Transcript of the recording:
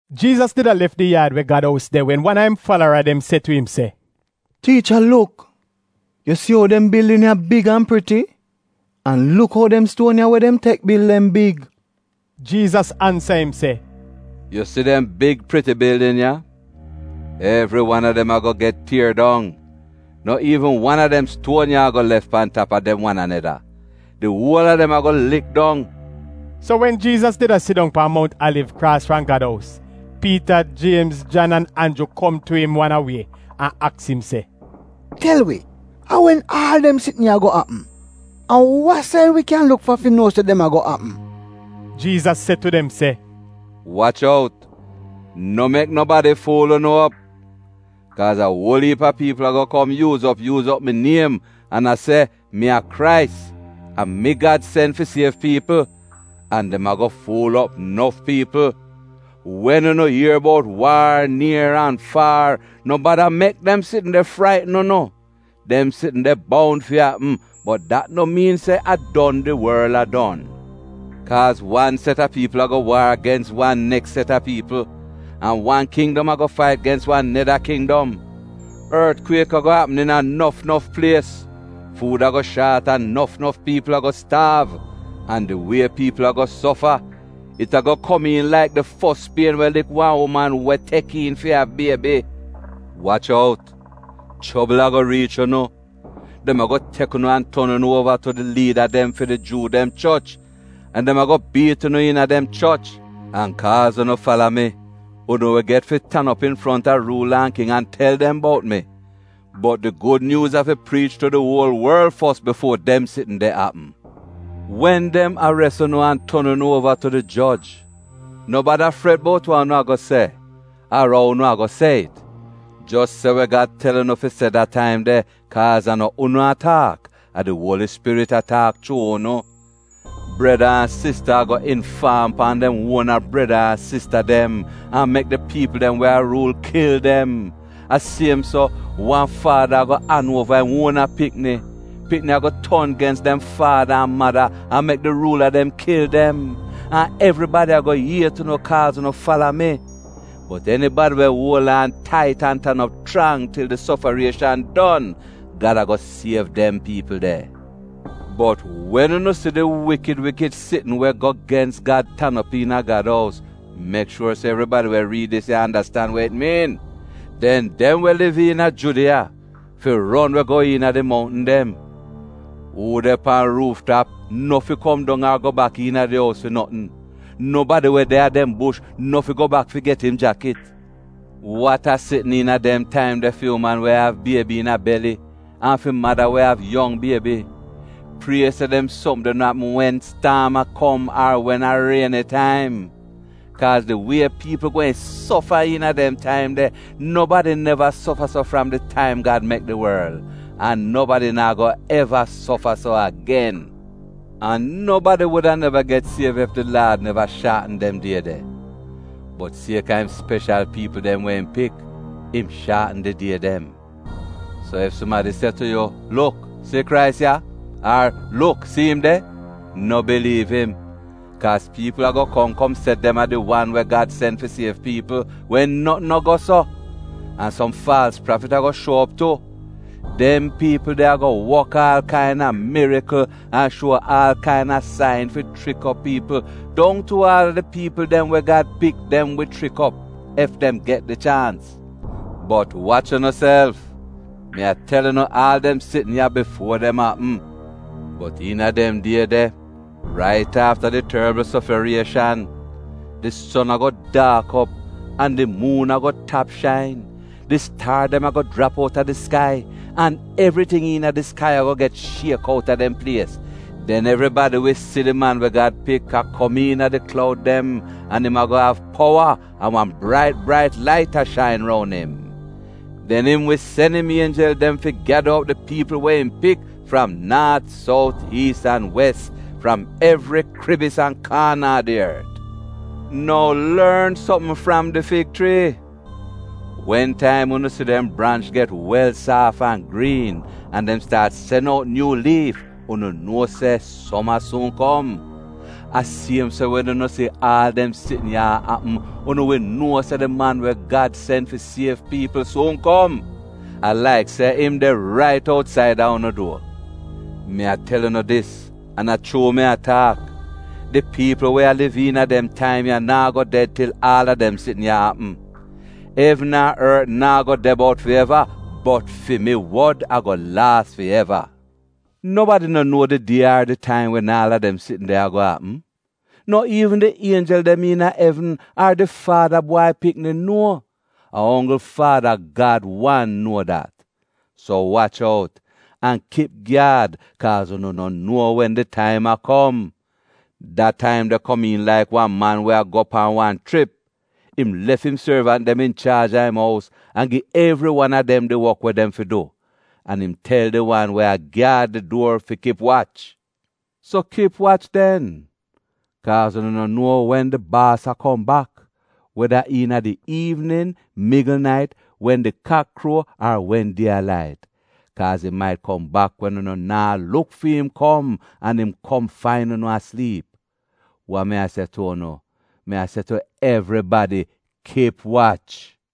Jiizas did a lef di yaad we Gad ous de wen wan a im falara dem se tu im se, “Tiicha, luk! Yu si ou dem bildin ya big an priti! An luk ou dem stuon ya we dem tek bil dem big!” Jiizas ansa im se, “Yu si dem big priti bildin ya? Evri wan a dem a-go get tier dong. No iivn wan a dem stuon ya a-go lef pan tap a dem wan aneda. Di uol a dem a-go lik dong!” So wen Jiizas did a sidong pan Mount Aliv kraas fram Gad ous, Piita, Jiemz, Jan an Anju kom tu im wan a wie an aks im se, “Tel wi, a wen aal dem sitn ya a-go apm? An wa sain wi kyan luk fa fi nuo se dem a-go apm?” Jiizas se tu dem se, “Wach out, no mek nobadi fuul unu op. Kaaz a uol iip a piipl a-go kom yuuz op yuuz op mi niem, an a se, ‘Mi a Krais, a mi Gad sen fi siev piipl,’ an dem a-go fuul op nof piipl. Wen unu ier bout waar nier an faar, no bada mek dem sitn de fraitn unu. Dem sitn de boun fi apm, bot dat no miin se a don di worl a don. Kaaz wan set a piipl a-go waar gens wan neks set a piipl, an wan kindom a-go fait gens wan neda kindom. Ortkwiek a-go apm iina nof nof plies. Fuud a-go shaat an nof nof piipl a-go staav. An di wie piipl a-go sofa, it a-go komiin laik di fos pien we lik wan uman we tek iin fi av Biebi. “Wach out. Chobl a-go riich unu. Dem a-go tek unu an ton unu uova tu di liida dem fi di Juu dem choch, an dem a-go biit unu iina dem choch. An kaaz unu fala mi, unu wi get fi tan op infronta ruula an king an tel dem bout mi. Bot di Gud Nyuuz afi priich tu di uol worl fos bifuo dem sitn de apm. Wen dem ares unu an ton unu uova tu di joj, no bada fret bout wa unu a-go se ar ou unu a-go se it. Jos se we Gad tel unu fi se da taim de, kaaz a no unu a taak, a di Uoli Spirit a taak chuu unu. “Breda an sista a-go infaam pan dem uona breda an sista dem an mek di piipl dem we a ruul kil dem. A siem so, wan faada a-go an uova im uona pikni. Pikni a-go ton gens dem faada an mada an mek di ruula dem kil dem. An evribadi a-go iet unu kaaz unu fala mi. Bot enibadi we uol aan tait an tan op chrang til di sofarieshan don, Gad a-go siev dem piipl de. “Bot wen unu si di wikid wikid sitn we go gens Gad tan op iina Gad ous — mek shuor se evribadi we riid dis ya andastan we it miin — den dem we liv iina Judiya fi ron we go iina di mountn dem. Uu de pan ruuf tap, no fi kom dong ar go bak iina di ous fi notn. Nobadi we de a dem bush, no fi go bak fi get im jakit. Wat a sitn iina dem taim de fi uman we av biebi iina beli an fi mada we av yong biebi! Prie se dem sopm de no apm wen staam a kom ar wen a rieni taim. Kaaz di wie piipl gweehn sofa iina dem taim de, nobadi neva sofa so fram di taim Gad mek di worl. An nobadi naa go eva sofa so agen. An nobadi wuda neva get siev ef di Laad neva shaatn dem die de. Bot siek-a im speshal piipl dem we im pik, im shaatn di die dem. So ef sumadi se tu yu, ‘Luk, si Krais ya!’ ar ‘Luk, si im de!’ No biliiv im. Kaaz piipl a-go kom kom se dem a di wan we Gad sen fi siev piipl, wen notn no go so. An som faalz prafit a-go shuo op tu. Dem piipl de a-go wok aal kain-a mirikl an shuo aal kain-a sain fi chrik op piipl, dong tu aal di piipl dem we Gad pik dem wi chrik op ef dem get di chaans. Bot wach unuself! Mi a tel unu aal dem sitn ya bifuo dem apm. “Bot iina dem die de, rait afta di torbl sofarieshan, “ ‘Di son a-go daak op, an di muun a-go tap shain; Di staar dem a-go jrap outa di skai, an evriting iina di skai a-go get shiek outa dem plies.’ “Den evribadi wi si di Man we Gad Pik a kom iina di kloud dem an im a-go av powa an wan brait brait lait a shain roun im. Den im wi sen im ienjel dem fi gyada op di piipl we im pik fram naat, sout, iis an wes, fram evri kribis an kaana a di ort. “Nou lorn sopm fram di fig chrii. Wen taim unu si dem branch get wel saaf an griin an dem staat sen out nyuu liif, unu nuo se soma suun kom. A siem so wen unu si aal dem sitn ya a apm, unu wi nuo se di Man we Gad sen fi siev piipl suun kom; a laik se im de rait outsaida unu duor. Mi a tel unu dis an a chuu mi a taak, di piipl we a liv iina dem taim ya naa go ded til aal a dem sitn ya apm. Evn an ort naa go de bout fi eva, bot fi mi wod a-go laas fi eva. “Nobadi no nuo di die ar di taim wen aal a dem sitn de a-go apm, no iivn di ienjel dem iina evn ar di Faada Bwai Pikni nuo, a onggl Faada Gad wan nuo dat. So wach out! An kip gyaad kaaz unu no nuo wen di taim a kom. Da taim de komiin laik wan man we a go we pan wan chrip. Im lef im sorvant dem inchaaj a im ous an gi evri wan a dem di wok we dem fi du. An im tel di wan we a gyaad di duor fi kip wach. “So kip wach den, kaaz unu no nuo wen di baas a kom bak — weda iina di iivnin, migl nait, wen di kak kruo, ar wen die a lait — kaaz im mait kom bak wen unu naa luk fi'im kom an im kom fain unu a sliip. Wa mi se tu unu, mi a se tu evribadi: ‘Kip wach!’”